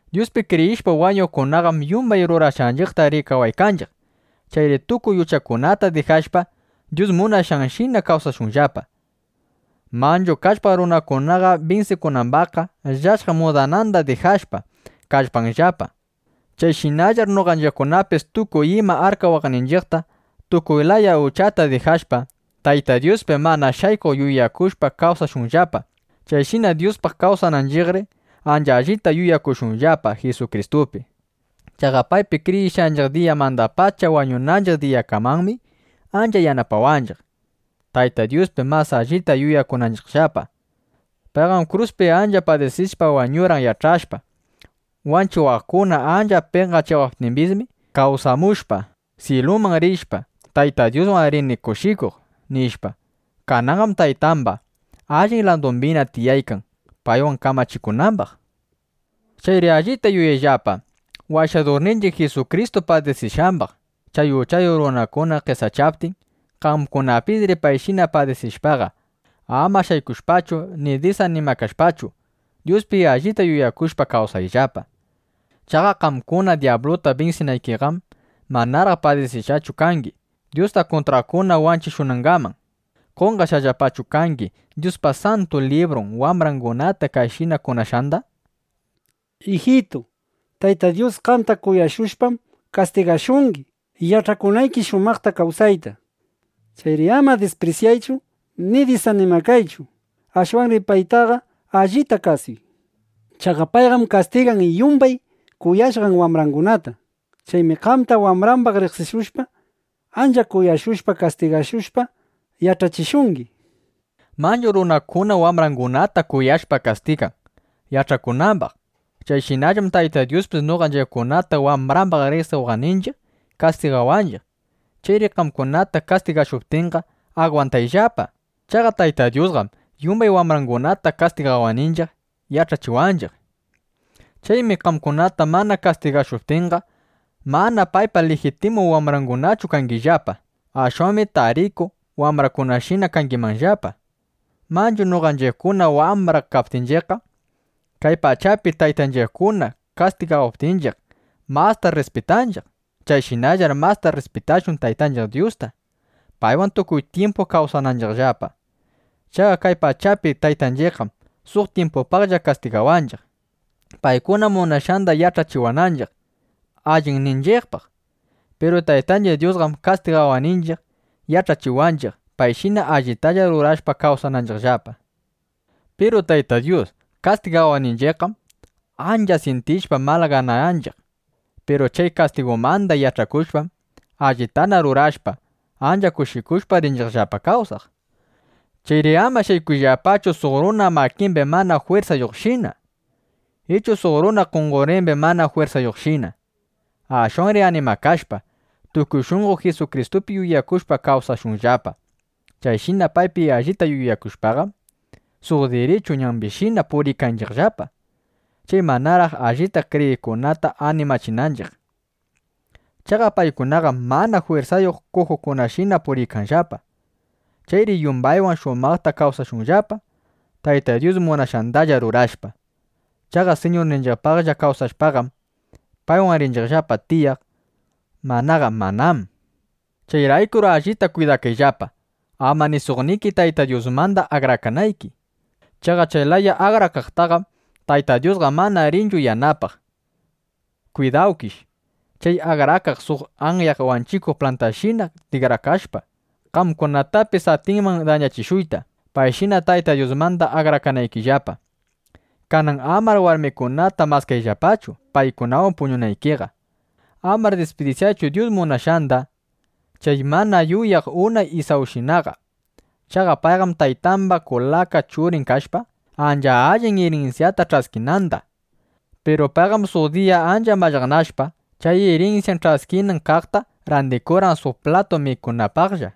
Dyuspi kriyishpa wañuqkunaqam yumbay rurashqanchiqta rikawaykanchiq. Chayri tukuy uchakunata dijashpa, Dyus munashqanshina kawsashunllapa. Manchu kallpaq runakunaqa binsikunambaqqa llashaq mudananda dijashpa, kallpanllapa. Chayshinallar noqanchiqkunapis tukuy ima arkawaqninchiqta, tukuy laya uchata dijashpa, Tayta Dyuspi mana shaykuq yuyakushpa kawsashunllapa. Chayshina Dyuspaq kawsananchiqri, ancha allita yuyakushunllapa Jisukristupi. Chaqa paypi kriyishqanchiq diyamandapacha wañunanchiq diyakamanmi ancha yanapawanchiq, Tayta Dyuspi mas allita yuyakunanchiqllapa. Payqam kruspi ancha padisishpa wañurqan yach'ashpa: Wanchiwaqkuna ancha penqachiwaptimbismi, kawsamushpa, syiluman rishpa, Taytay Dyuswan rini kushikuq, nishpa. Kananqam Taytamba allin ladumbina tiyaykan, paywan kamachikunambaq. Chayri allita yuyayllapa Washadurninchiq Jisukristu padisishqambaq, chay uchayuq runakuna qesachaptin. Qamkunapisri payshina padisishpaqa, ama shaykushpachu ni disanimakashpachu, Dyuspi allita yuyakushpa kawsayllapa. Chaqa qamkuna dyabluta binsinaykiqam, manaraq padisishqachu kangi, Dyusta kuntraqkuna wanchishunangaman. ¿Qonqashqallapachu kangi Dyuspa Santu Librun wambrangunata kayshina kunashqanda? Ijitu, Tayta Dyus qamta kuyashushpam kastigashungi, yach'akunayki shumaqta kawsayta. Chayri ama disprisyaychu ni disanimakaychu. (Ashwanri paytaqa allita kasuy.) Chaqa payqam kastigan yumbay kuyashqan wambrangunata. Chaymi qamta wambrambaq riqsishushpa, ancha kuyashushpa, kastigashushpa, yach'achishungi, nishpa. Manchu runakuna wambrangunata kuyashpa kastigan, yach'akunambaq. Chayshinallam Tayta Dyuspis noqanchiqkunata wambrambaq riqsiwaqninchiq, kastigawanchiq. Chayri qamkunata kastigashuptinqa, agwantayllapa. Chaqa Tayta Dyusqam yumbay wambrangunata kastigawaqninchiq yach'achiwanchiq. Chaymi qamkunata mana kastigashuptinqa, mana paypa lijitimu wambrangunachu kangillapa. Ashwanmi tarichu wambrakunashina kangimanllapa. Manchu noqanchiqkuna wambra kaptinchiqqa, kay pachapi taytanchiqkuna kastigawaptinchiq, masta rrispitanchiq. Chayshinallar masta rrispitashun Taytanchiq Dyusta, paywan tukuy tyimpu kawsananchiqllapa. Chaqa kay pachapi taytanchiqqam suq tyimpupaqlla kastigawanchiq, paykuna munashqanda yach'achiwananchiq allinninchiqpaq. Piru Taytanchiq Dyusqam kastigawaqninchiq, yach'achiwanchiq, payshina allitalla rurashpa kawsananchiqllapa. Piru Tayta Dyus kastigawaptinchiqqam, ancha syintishpa, malaganayanchiq. Piru chay kastigumanda yach'akushpam, allitana rurashpa, ancha kushikushpa rinchiqllapa kawsaq. Chayri ama shaykushunllapachu suq runa makimbi mana jwirsayuqshina ichu suq runa qonqorimbi mana jwirsayuqshina. Ashwanri animakashpa, tukuy shunqo Jisukristupi yuyakushpa kawsashunllapa. Chayshina paypi allita yuyakushpaqam, suq dirichu ñambishina puriykanchiqllapa, chay manaraq allita kriyiqkunata animachinanchiq. Chaqa paykunaqam mana jwirsayuq kujukunashina puriykanllapa. Chayri yumbaywan shumaqta kawsashunllapa, Tayta Dyus munashqandalla rurashpa. Chaqa Siñurninchiqpaqlla kawsashpaqam, paywan rinchiqllapa tiyaq; manaqa manám. Chayraykur allita kwidakayllapa, ama ni suqniki Tayta Dyusmanda akrakanayki. Chaqa chay laya akrakaqtaqam Tayta Dyusqa mana rinchu yanapaq. Kwidawkish chay akrakaqqa suq ayaq wanchikuq plantashina tikrakashpa, qamkunatapis atinman dañachishuyta, payshina Tayta Dyusmanda akrakanaykillapa. Kanan amar warmikunata maskayllapachu, paykunawan puñunaykiqa. Amar disprisyaychu Dyus munashqanda chay mana yuyaq unay Isawshinaqa. Chaqa payqam taytamba kulaka churin kashpa, ancha allin irinsyata ch'askinanda. Piru payqam suq diya ancha mallaqnashpa, chay irinsyan ch'askinan kaqta randikurqan suq platu mikunapaqlla.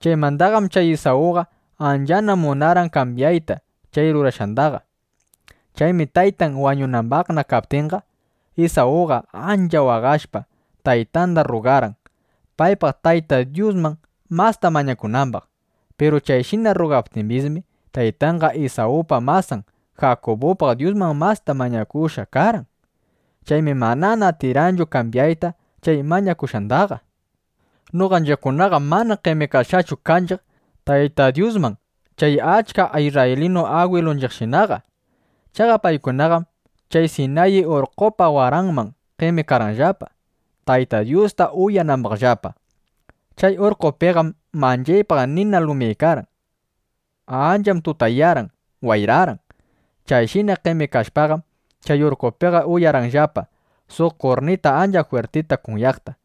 Chaymandaqam chay Isawqa anchana munarqan kambyayta chay rurashqandaqa. Chaymi taytan wañunambaqna kaptinqa, Isawqa ancha waqashpa, taytanda rrugarqan, paypaq Tayta Dyusman masta mañakunambaq. Piru chayshina rrugaptimbismi, taytanqa Isawpa masan Jakubupaq Dyusman masta mañakushqa karqan. Chaymi manana atirqanchu kambyayta chay mañakushqandaqa. Noqanchiqkunaqam mana qemikashqachu kanchiq Tayta Dyusman chay achka isrraylinu agwilunchiqshinaqa. Chaqa paykunaqam chay Sinayi urqqopa waranman qemikarqanllapa, Tayta Dyusta uyanambaqllapa. Chay urqqopiqam manchaypaq nina lumyaykarqan. Ancham tutayarqan, wayrarqan. Chayshina qemikashpaqam, chay urqqopiqa uyarqanllapa suq kurnita ancha jwirtita kunyaqta.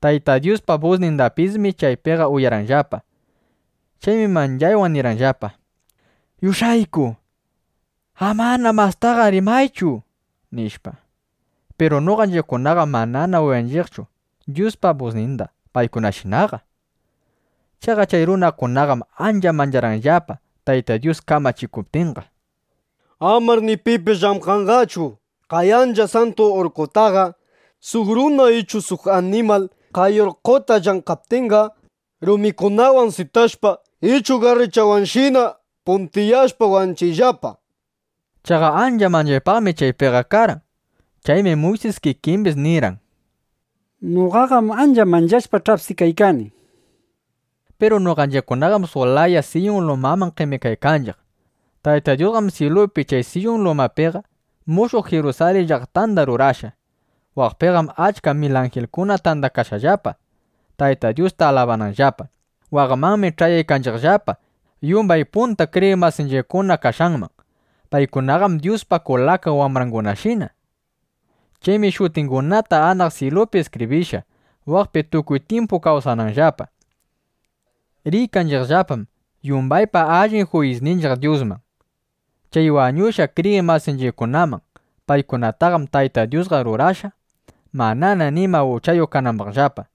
Tayta Dyuspa busnindapismi chaypiqa uyarqanllapa. Chaymi manchaywan nirqanllapa: “¡Yush'ayku, amana mastaqa rimaychu!” nishpa. Piru noqanchiqkunaqam mana uyanchiqchu Dyuspa busninda paykunashinaqa. Chaqa chay runakunaqam ancha mancharqanllapa, Tayta Dyus kamachikuptinqa: “Amar ni pipis llamkanqachu kay ancha santu urqqotaqa. Suq runa ichu suq animal kay urqqota llamkaptinqa, rumikunawan sitashpa, ˻ichu garruchawanshina puntiyashpa,˼ wanchiyllapa”, nishpa. Chaqa ancha manchaypaqmi chaypiqa karqan. Chaymi Muysis kikimbis nirqan: “Noqaqam ancha manchashpa, ch'apsikaykani”, nishpa. Piru noqanchiqkunaqam suq laya Siyun lumaman qemikaykanchiq. Tayta Dyusqam syilupi chay Siyun lumapiqa mushuq Jirusalin llaqtanda rurashqa. Waqpiqam achka mil anjilkuna tandakashqallapa, Tayta Dyusta alabananllapa. Waqmanmi ch'ayaykanchiqllapa yumbay punta kriyiq masinchiqkuna kashqanman. Paykunaqam Dyuspa kulaka wambrangunashina. Chaymi shutingunata anaq syilupi iskibrishqa, waqpi tukuy tyimpu kawsananllapa. Riykanchiqllapam yumbaypa allin juyisninchiq Dyusman, chay wañushqa kriyiq masinchiqkunaman. Paykunataqam Tayta Dyusqa rurashqa, manana nima uchayuq kanambaqllapa.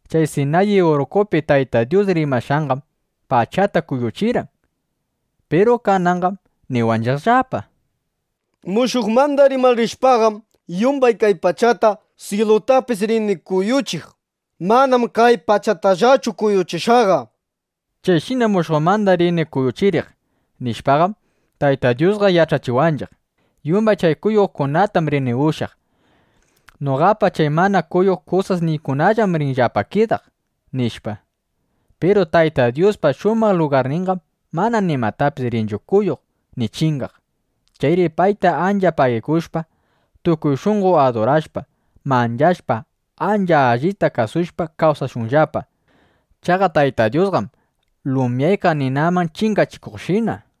Chay Sinayi urqqopi Tayta Dyus rimashqanqam pachata kuyuchirqan. Piru kananqam niwanchiqllapa: “Mushuqmanda rimarishpaqam, yumbay kay pachata, syilutapis rini kuyuchiq. Manam kay pachatallachu kuyuchishaqqa”, nishpa. Chayshina “Mushuqmanda rini kuyuchiriq”, nishpaqam, Tayta Dyusqa yach'achiwanchiq: Yumbay chay kuyuqkunatam rini ushyaq. Noqapa chay mana kuyuq kusasniykunallam rinllapa kidaq, nishpa. Piru Tayta Dyuspa shumaq lugarninqam mana nimatapis rinchu kuyuq ni chingaq. Chayri payta ancha pagikushpa, tukuy shunqo adurashpa, manchashpa, ancha allita kasushpa, kawsashunllapa. Chaqa Tayta Dyusqam lumyaykaq nina chingachikuqshina.